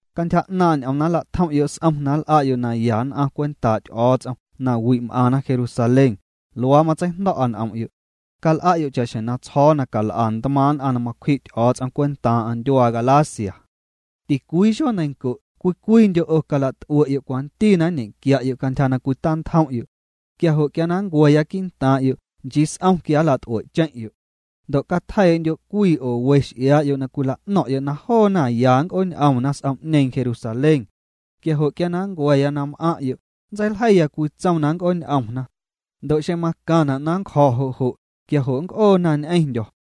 Cantyja 'naaⁿ' ñ'oom na nla'tjom'yo' s'om na nl'a'yo' naya nn'aⁿ cwentaa' Ty'o̱o̱ts'om na wi' m'aⁿna Jerusalén, luaa matseijndo̱'a n'om'yo'. Cal'a'yo' cha'xjeⁿ na tsjo̱o̱ na cal'a ntmaaⁿ' nn'aⁿ na macwji' Ty'o̱o̱ts'om cwentaaⁿ'aⁿ ndyuaa Galacia. Ticwii xueeneiⁿnco' cwii cwiindyo' 'o calat'ue'yo' cwanti na nñequia'yo' cantyja na cwitantjom'yo'. Quia jo' quia na nncua̱ya quii'ntaaⁿ'yo' nchii s'om quia nlat'ue'cheⁿ'yo'. Ndo' catjeii'ndyo' cwii oo we x'iaa'yo' na cwila'no̱ⁿ'yo' na joona ya na nnc'ooñ'omna s'om'ñeeⁿ Jerusalén. Quia jo' quia na nncua̱ na m'aⁿ'yo', nntseiljeiya cwii tsom na nnc'ooñ'omna. Ndo' xeⁿ macaⁿna' na nncjo̱ jo' jo', quia jo' nnc'oona ñ'eⁿndyo̱.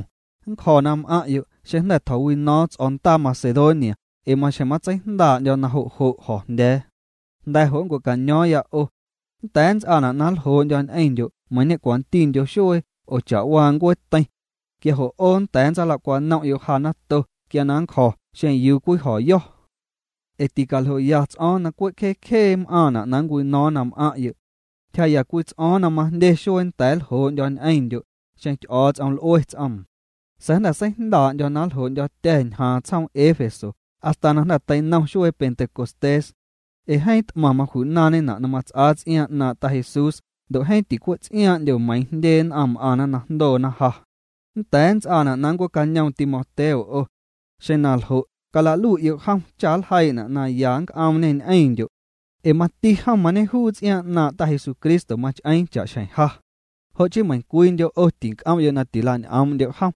Nncjo̱ na m'aⁿ'yo' xeⁿ jnda̱ tjo̱wino̱o̱ⁿ ts'o̱o̱ndaa Macedonia ee maxjeⁿ matseijndaa'ndyo̱ na jo' jo̱jndya̱a̱. Jnda̱ jo' nncua̱caño̱o̱ⁿya 'o. Nnda̱a̱ nnts'aana' na nljoo'ndyo̱ ñ'eⁿndyo' meiiⁿ ñe'cwantindyo xuee oo cha'waa ncueeteiⁿ. Quia jo' 'o nnda̱a̱ nntsalacwanom'yo' ja nato quia na nncjo̱ xeⁿ yuu cwijo̱yo̱. Ee ticaljoya ts'o̱o̱ⁿ na cwe' cjee cjee m'aaⁿna' nncwino̱o̱ⁿ na m'aⁿ'yo'. Ntyjaa'ya cwii ts'o̱o̱ⁿ na majndye xuee nnda̱a̱ nljoo'ndyo̱ ñ'eⁿndyo', xeⁿ Ty'o̱o̱ts'om l'ue ts'oom. Sa̱a̱ jnda̱ seijndaa'ndyo̱ na nljoo'ndyo̱tya̱ ñjaaⁿ tsjoom Éfeso hasta na jnda̱ teinom xuee Pentecostés. Ee jeeⁿ t'maⁿ maju'naaⁿñena' na mats'aa ts'iaaⁿ 'naaⁿ' Ta Jesús ndo' jeeⁿ ticwe' ts'iaaⁿ'ndyo meiiⁿ jndye nn'aⁿ m'aⁿ na jndoo ja. Nnda̱a̱ nnts'aana' na nncuee'cañoom Timoteo 'o. Xeⁿ na ljo', cala'lui'yo' jom cha nljeii'na' na ya nnc'oomñê ñ'eⁿndyo'. Ee mati jom mañejuu ts'iaaⁿ 'naaⁿ' Ta Jesucristo mach'eeⁿ cha'xjeⁿ ja. Jo' chii meiⁿcwiindyo' 'o tinc'om'yo' na tila'ñ'oom'ndyo' jom.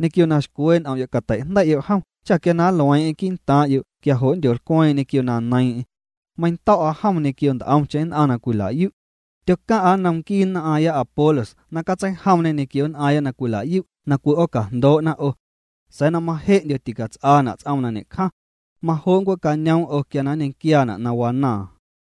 Ñequio na xcwee' n'om'yo' cateijndei'yo' jom cha quia nlueeⁿ'eⁿ quii'ntaaⁿ'yo' quia jo' nndyolcweeⁿ'eⁿ ñequio na neiiⁿ'eⁿ. Meiⁿndo̱'a jom ñequio nt'omcheⁿ nn'aⁿ na cwila'yu'. Tyocaⁿ'a nnom nquii nn'aaⁿya Apolos na catseijomñê ñequio nn'aaⁿya na cwila'yu' na cwi'oocajndoo'na 'o. Sa̱a̱ na maje'ndyo ticats'aana' ts'oom na ñe'cjaⁿ. Majo' nncuee'cañoom 'o quia na nñequiaana' na wanaaⁿ.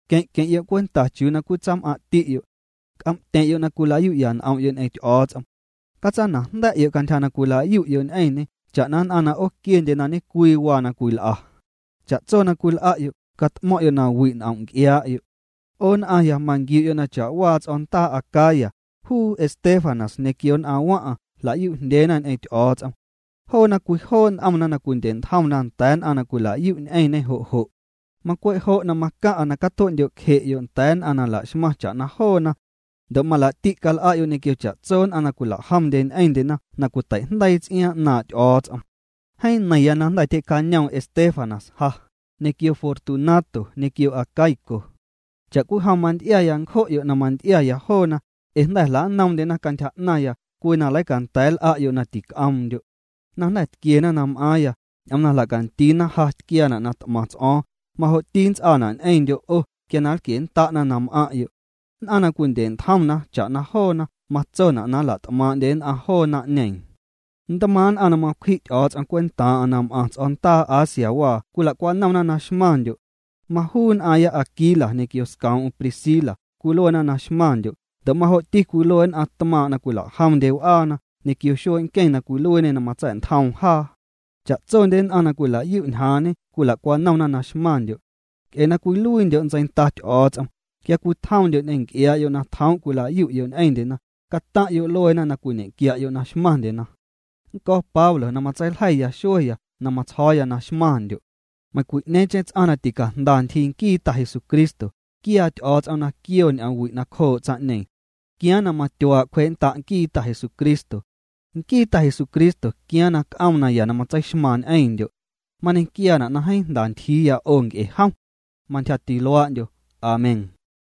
Queⁿ' queⁿ'yo' cwenta chiuu cwii tsam'aⁿ'ti'yo'. C'om'tyeⁿ'yo' na cwila'yu'ya n'om'yo' ñ'eⁿ Ty'o̱o̱ts'om. Catsanajnda̱'yo' cantyja na cwila'yu'yo' ñ'eⁿñê cha'na nn'aⁿ na 'ooquiendye na ñe'cwii waa na cwil'a. Cha'tso na cwil'a'yo', cat'mo̱ⁿ'yo' na wi' n'om' nc'iaa'yo'. 'O nn'aⁿya, manquiu'yo' na cha'waa ts'o̱o̱ndaa Acaya, juu Estéfanas ñequio nn'aⁿ waⁿ'aⁿ jla'yu'jndyeena ñ'eⁿ Ty'o̱o̱ts'om. Joona cwijoo' n'omna na cwindye'ntjomna nda̱a̱ nn'aⁿ na cwila'yu' ñ'eⁿñê jo' jo'. Macwe' jo' macaⁿ'a na catue'ndyo'cje'yo' nda̱a̱ nn'aⁿ na la'xmaⁿ cha'na joona. Ndo' malaa'ti' cal'a'yo' ñequio cha'tso nn'aⁿ na cwilajomndye ñ'eⁿndyena na cwiteijndeii ts'iaaⁿ 'naaⁿ' Ty'o̱o̱ts'om. Jeeⁿ neiⁿya na jnda̱ tyjee'cañoom Estéfanas ja, ñequio Fortunato ñequio Acaico. Cha'cwijom manty'iaya ncjo'yo' na manty'iaya joona, ee jnda̱ jla'noomndyena cantyja 'naⁿya cwii na leicanda̱a̱ nl'a'yo' na tic'oomndyo'. Na jnda̱ tquiena na m'aaⁿya, ñ'oom na jla'candiina ja tquiaana' na t'maⁿ ts'o̱o̱ⁿ, majo'ti nnts'aana' ñ'eⁿndyo' 'o quia na nlquiennda'na na m'aⁿ'yo'. Nn'aⁿ na cwindye'ntjomna cha'na joona matsona' na nla't'maaⁿ'ndye nn'aⁿ joo naⁿ'ñeeⁿ. Ntmaaⁿ' nn'aⁿ na macwji' Ty'o̱o̱ts'om cwentaaⁿ'aⁿ na m'aⁿ ts'o̱o̱ndaa Asiawaa cwila'cwanomna na xmaⁿndyo'. Majuu nn'aaⁿya Aquila ñequio scoom'm Priscila cwiluena na xmaⁿndyo' ndo' majo'ti cwilue nn'aⁿ tmaaⁿ' na cwitjomndye w'aana ñequio xuee' nqueⁿ na cwiluiiñê na matsa̱'ntjoom jaa. Cha'tsondye nn'aⁿ na cwila'yu' ñjaaⁿñe cwila'cwanomna na xmaⁿndyo'. Nc'e na cwiluiindyo' ntseinda Ty'o̱o̱ts'om, quia cwitjomndyo' ñ'eⁿ nc'iaa'yo' na tjoom' cwila'yu'yo' ñ'eⁿndyena, cataⁿ'yo' lueena na cwiñe'quia'yo' na xmaⁿndyena. Nnco̱ Pablo na matseiljei xueya na matsjo̱o̱ya na xmaⁿndyo'. Meiⁿcwi'ñeeⁿcheⁿ ts'aⁿ na ticajnda ntyjii nquii Ta Jesucristo, quiaa Ty'o̱o̱ts'om na quioo ñ'oomwi' nacjoo' tsaⁿ'ñeeⁿ. Quiaaⁿ na matyuaa' cwjee'nnda' nquii Ta Jesucristo. Nquii Ta Jesucristo quiaaⁿ na c'oom naya na matseixmaaⁿ ñ'eⁿndyo'. Mañequiaana' na jeeⁿ jnda ntyjiiya 'o nc'e jom. Mantyjati luaa'ndyo. Amén.